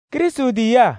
Krɩstʋ tiyiyaa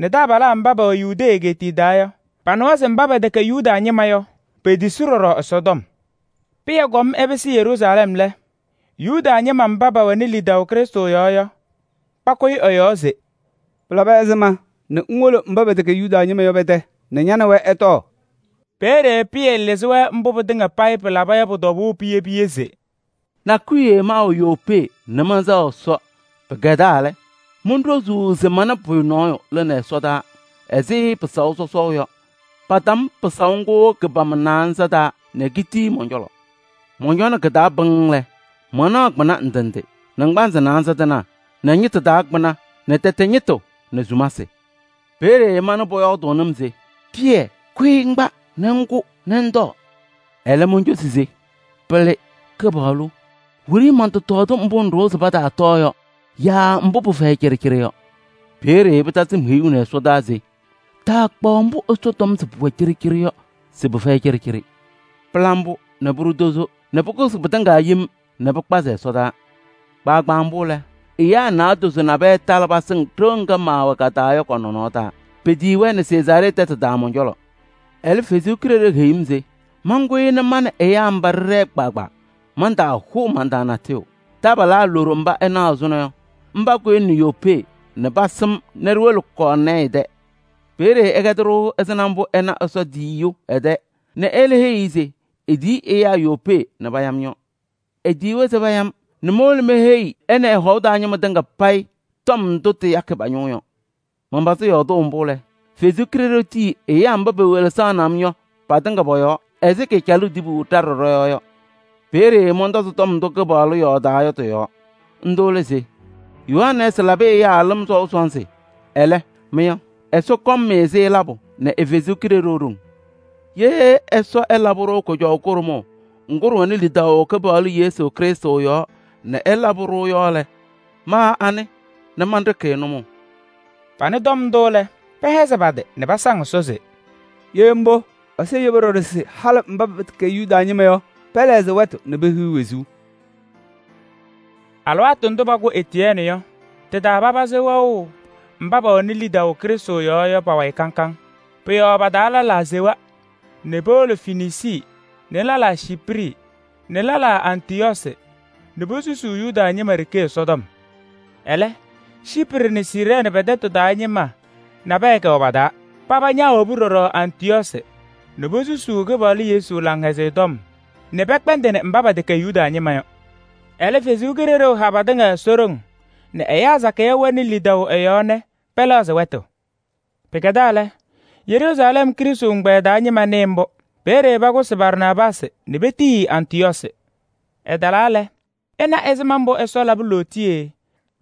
nɛ taabalaa mba pɛwɛ Yudee egeetiye taa yɔ, panɩwa se mba pɛtɛkɛ Yuda ñɩma yɔ, petisi ɖɔɖɔ Ɛsɔtɔm. Pɩyɛ kɔm ɛpɩsɩ Yeruusalɛm lɛ, Yuda ñɩma mba pɛwɛnɩ lidaʋ Krɩstʋ yɔɔ yɔ, pakʋyɩ ɛ-yɔɔ se: “Pɩlabɩ ɛzɩma nɛ ŋwolo mba pɛtɛkɛ Yuda ñɩma yɔ pɛ-tɛ nɛ ña nɛ wɛ ɩtɔɔ?” Peeye Pɩyɛ lɩzɩ-wɛ mbʋ pɩtɩŋa payɩ pɩlaba yɔ pʋ-tɔbʋʋ piye piye se: “Nakʋyʋ wiye maawɛ Yopee nɛ mɛnsɛɣ Ɛsɔ. Pɩkɛdaa lɛ, monɖozuu se mana pʋyʋ nɔɔyʋ lɩnɩ ɛsɔdaa ɛzɩ pɩsaʋ sɔsɔʋ yɔ, patam pɩsaʋ ngʋ kɩ-pama naanza taa nɛ kitii mɔn-cɔlɔ. Mɔncɔnɩ kɩ-taa pɩŋŋ lɛ, manaɣ kpɩna ndɩ ndɩ: naŋgbanzɩ naanza tɩnaa nɛ ñɩtʋ taa kpɩna nɛ tɛtɛ ñɩtʋ nɛ sumasɩ. Peeye manɩ Pʋyɔɔdʋʋnɩ-m se: ‘Pɩyɛ! Kʋyɩ ŋkpa nɛ ŋkʋ nɛ ŋtɔɔ.’ Ɛlɛ, moncosi se: ‘Pɩlɩ! Kɩpaɣlʋ, wiɖiyi mɔntɔtɔɔdɩ mbʋ ŋɖʋwa se pataatɔɔ yɔ yaa mbʋ pɩfɛyɩ cɩɖɩcɩɖɩ yɔ.’ Peeye pɩtasɩ-m heyuu nɛ ɛsɔdaa se: ‘Taakpaɣ mbʋ Ɛsɔ tɔm se pʋwɛ cɩɖɩcɩɖɩ yɔ se pɩfɛyɩ cɩɖɩcɩɖɩ.’ Pɩla mbʋ nɛ pʋɖʋ tozo nɛ pʋkʋsɩ pɩtɩŋa yem nɛ pɩkpazɩ ɛsɔdaa. Kpaagbaa mbʋ lɛ, ɛyaa naadozo nabɛyɛ talɩ pasɩŋ ɖɩɣa ŋga maawɛ ka-taa yɔ kɔ-nɔnɔɔ taa. Petiyi-wɛ nɛ Sezaaree tɛtʋ taa mɔn-cɔlɔ. Ɛlɛ, Ɛsɔ Kalɩzaɣ heyi-m se mankʋyɩ nɛ ma nɛ ɛyaa mba ɖɩɖɛɛ kpaagbaa, mantaahʋʋ man-taa natʋyʋ. Taabalaa loɖo mba ɩnaɣ ɛzʋnɔ yɔ, mba kʋyɩnɩ Yopee nɛ pasɩ-m nɛ ɖiwolo Kɔɔrnɛɛyɩ tɛ. Peeye ɛkɛdɩ-ɖʋ ɛzɩma mbʋ ɛna Ɛsɔ tiyiyu ɛ-tɛ nɛ ɛlɛ heyi-i se etiyi ɛyaa Yopee nɛ paya-m yɔ. Etiyi-i se paya-m nɛ mowolo meheyi ɛ nɛ ɛ-hɔʋ taa ñɩma tɩŋa payɩ tɔm ndʋ tɩyakɩ pa-ñʋʋ yɔ. Manpazɩ yɔɔdʋʋ mbʋ lɛ, Ɛsɔ Kalɩzaɣ tii ɛyaa mba pewelesaɣnɩ-m yɔ patɩŋa pɔ-yɔɔ ɛzɩ kaacalʋʋ tibu ɖa ɖɔ-yɔɔ yɔ. Peeye mɔntɔzɩ tɔm ndʋ Kɩpaɣlʋ yɔɔdaa yɔ tɩ-yɔɔ. Ndʋ lɛ se: ‘Yohanɛɛsɩ labɩ ɛyaa lɩm sɔʋ sɔnzɩ. Ɛlɛ, mɩ yɔ, Ɛsɔ kɔŋ-mɩ-sɩ labʋ nɛ ɛ-Kalɩzaɣ haʋ.’ Ye Ɛsɔ ɛlabɩ-wɛ kʋjɔʋ kʋɖʋmʋʋ ŋgʋ ɖɩwɛnɩ lidaʋ Kɩpaɣlʋ Yesu Krɩstʋ yɔɔ nɛ ɛlabɩ-ɖʋ yɔ lɛ, ma anɩ nɛ manɖɩkɩ-ɩ nʋmɔʋ?” Panɩ tɔm ndʋ lɛ, pɛhɛzɩ pa-tɩ nɛ pasaŋ Ɛsɔ se: “Ye mbʋ, Ɛsɔ yebi ɖɔɖɔ se halɩ mba pɛtɛkɛ Yuda ñɩma yɔ, pɛlɛɣzɩ wɛtʋ nɛ pehiɣ wezuu!” Alɩwaatʋ ndʋ pakʋ Etiyɛɛnɩ yɔ, tɩ-taa papazɩ wɛʋ mba pɛwɛnɩ lidaʋ Krɩstʋ yɔɔ yɔ pa-wayɩ kaŋ kaŋ. Pʋ-yɔɔ pa-taa lɛlaa sewa nɛ powolo Fenisii nɛ lɛlaa Ciiprɩ nɛ lɛlaa Antɩyɔɔsɩ nɛ posusuu Yuda ñɩma ɖeke Ɛsɔtɔm. Ɛlɛ, Ciiprɩ nɛ Siirɛɛnɩ pɛ-tɛtʋ taa ñɩma nabɛyɛ kɛwɛ pa-taa. Paba ñaawobi ɖɔɖɔ Antɩyɔɔsɩ nɛ posusuu Kɩpaɣlʋ Yesu Laŋhɛzɩyɛ Tɔm nɛ pɛkpɛndɩnɩ mba pɛtɛkɛ Yuda ñɩma yɔ. Ɛlɛ kaha patɩŋa e-ɖoŋ nɛ ɛyaa sakɩyɛ wɛnɩ lidaʋ ɛ-yɔɔ nɛ pɛlɛɣzɩ wɛtʋ. Pɩkɛdaa lɛ, Yeruusalɛm Krɩstʋ ɛgbɛyɛ taa ñɩma nɩɩ mbʋ. Peeye pakʋsɩ Barnaabaasɩ nɛ petiyi-i Antɩyɔɔsɩ. Ɛtalaa lɛ, ɛna ɛzɩma mbʋ Ɛsɔ labɩ lootiye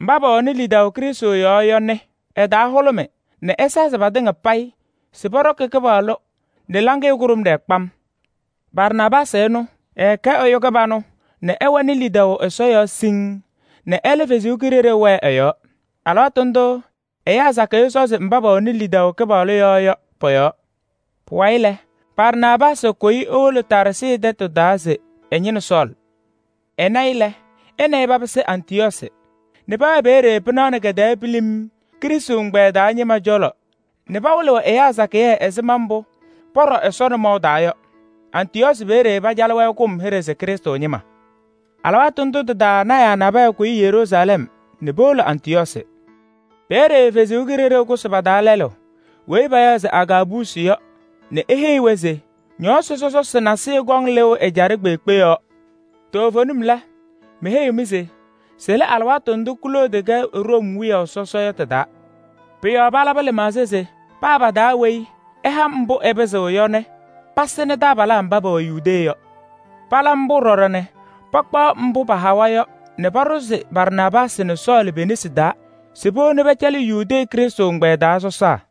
mba pɛwɛnɩ lidaʋ Krɩstʋ yɔɔ yɔ nɛ ɛ-taa hʋlʋmɩ nɛ ɛsazɩ patɩŋa payɩ se pɔɖɔkɩ Kɩpaɣlʋ nɛ laŋɩyɛ kʋɖʋmɖɩyɛ kpam. Barnaabaasɩ ɛnʋ, ɛɛkɛ ɛyʋ kɩbanʋ nɛ ɛwɛnɩ lidaʋ Ɛsɔ yɔɔ siŋŋ nɛ ɛlɛ Kalɩzaɣ wɛɛ ɛ-yɔɔ. Alɩwaatʋ ndʋʋ ɛyaa sakɩyɛ sɔzɩ mba pɛwɛnɩ lidaʋ Kɩpaɣlʋ yɔɔ yɔ pɔ-yɔɔ. Pʋwayɩ lɛ, Barnaabaasɩ kʋyɩ ewolo Taarsɩ tɛtʋ taa se ɛñɩnɩ Sɔɔlɩ. Ɛna-ɩ lɛ, ɛ nɛ ɩ papɩsɩ Antɩyɔɔsɩ nɛ pɛwɛɛ peeye pɩnaɣ nɛ kɛ-tɛɛ pilim Krɩstʋ ɛgbɛyɛ taa ñɩma cɔlɔ nɛ pawɩlɩɣ ɛyaa sakɩyɛ ɛzɩma mbʋ pɔɖɔ Ɛsɔ nɔmɔʋ taa yɔ. Antɩyɔɔsɩ peeye pacalɩ-wɛ kʋm hɩɖɛ se Krɩstʋ ñɩma. Alɩwaatʋ ndʋ tɩ-taa lɔɔyɩsɩ tɩnaa nabɛyɛ kʋyɩ Yeruusalɛm nɛ powolo Antɩyɔɔsɩ. Peeye Ɛsɔ Kalɩzaɣ kʋsɩ pa-taa lɛlʋ weyi payaɣ se Agaabusi yɔ nɛ eheyi-wɛ se ñɔɔsɩ sɔsɔsɩ nasɩyɩ kɔŋ lɩʋ ɛjaɖɛ kpeekpe. Toovenim lɛ, meheyiɣ-mɩ se sɩlɩ alɩwaatʋ ndʋ Kloodi kɛ Room wiyaʋ sɔsɔ yɔ tɩ-taa. Pʋ-yɔɔ palabɩ lɩmaɣza se paa pa-taa weyi ɛha mbʋ ɛpɩzɩɣ yɔ nɛ pasɩnɩnɩ taabalaa mba pɛwɛ Yudee yɔ. Pala mbʋ ɖɔɖɔ nɛ pakpaɣ mbʋ pahawa yɔ nɛ paɖʋzɩ Barnaabaasɩ nɛ Sɔɔlɩ pe-nesi taa se powoni pɛcɛlɩ Yudee Krɩstʋ ɛgbɛyɛ taa sɔsaa.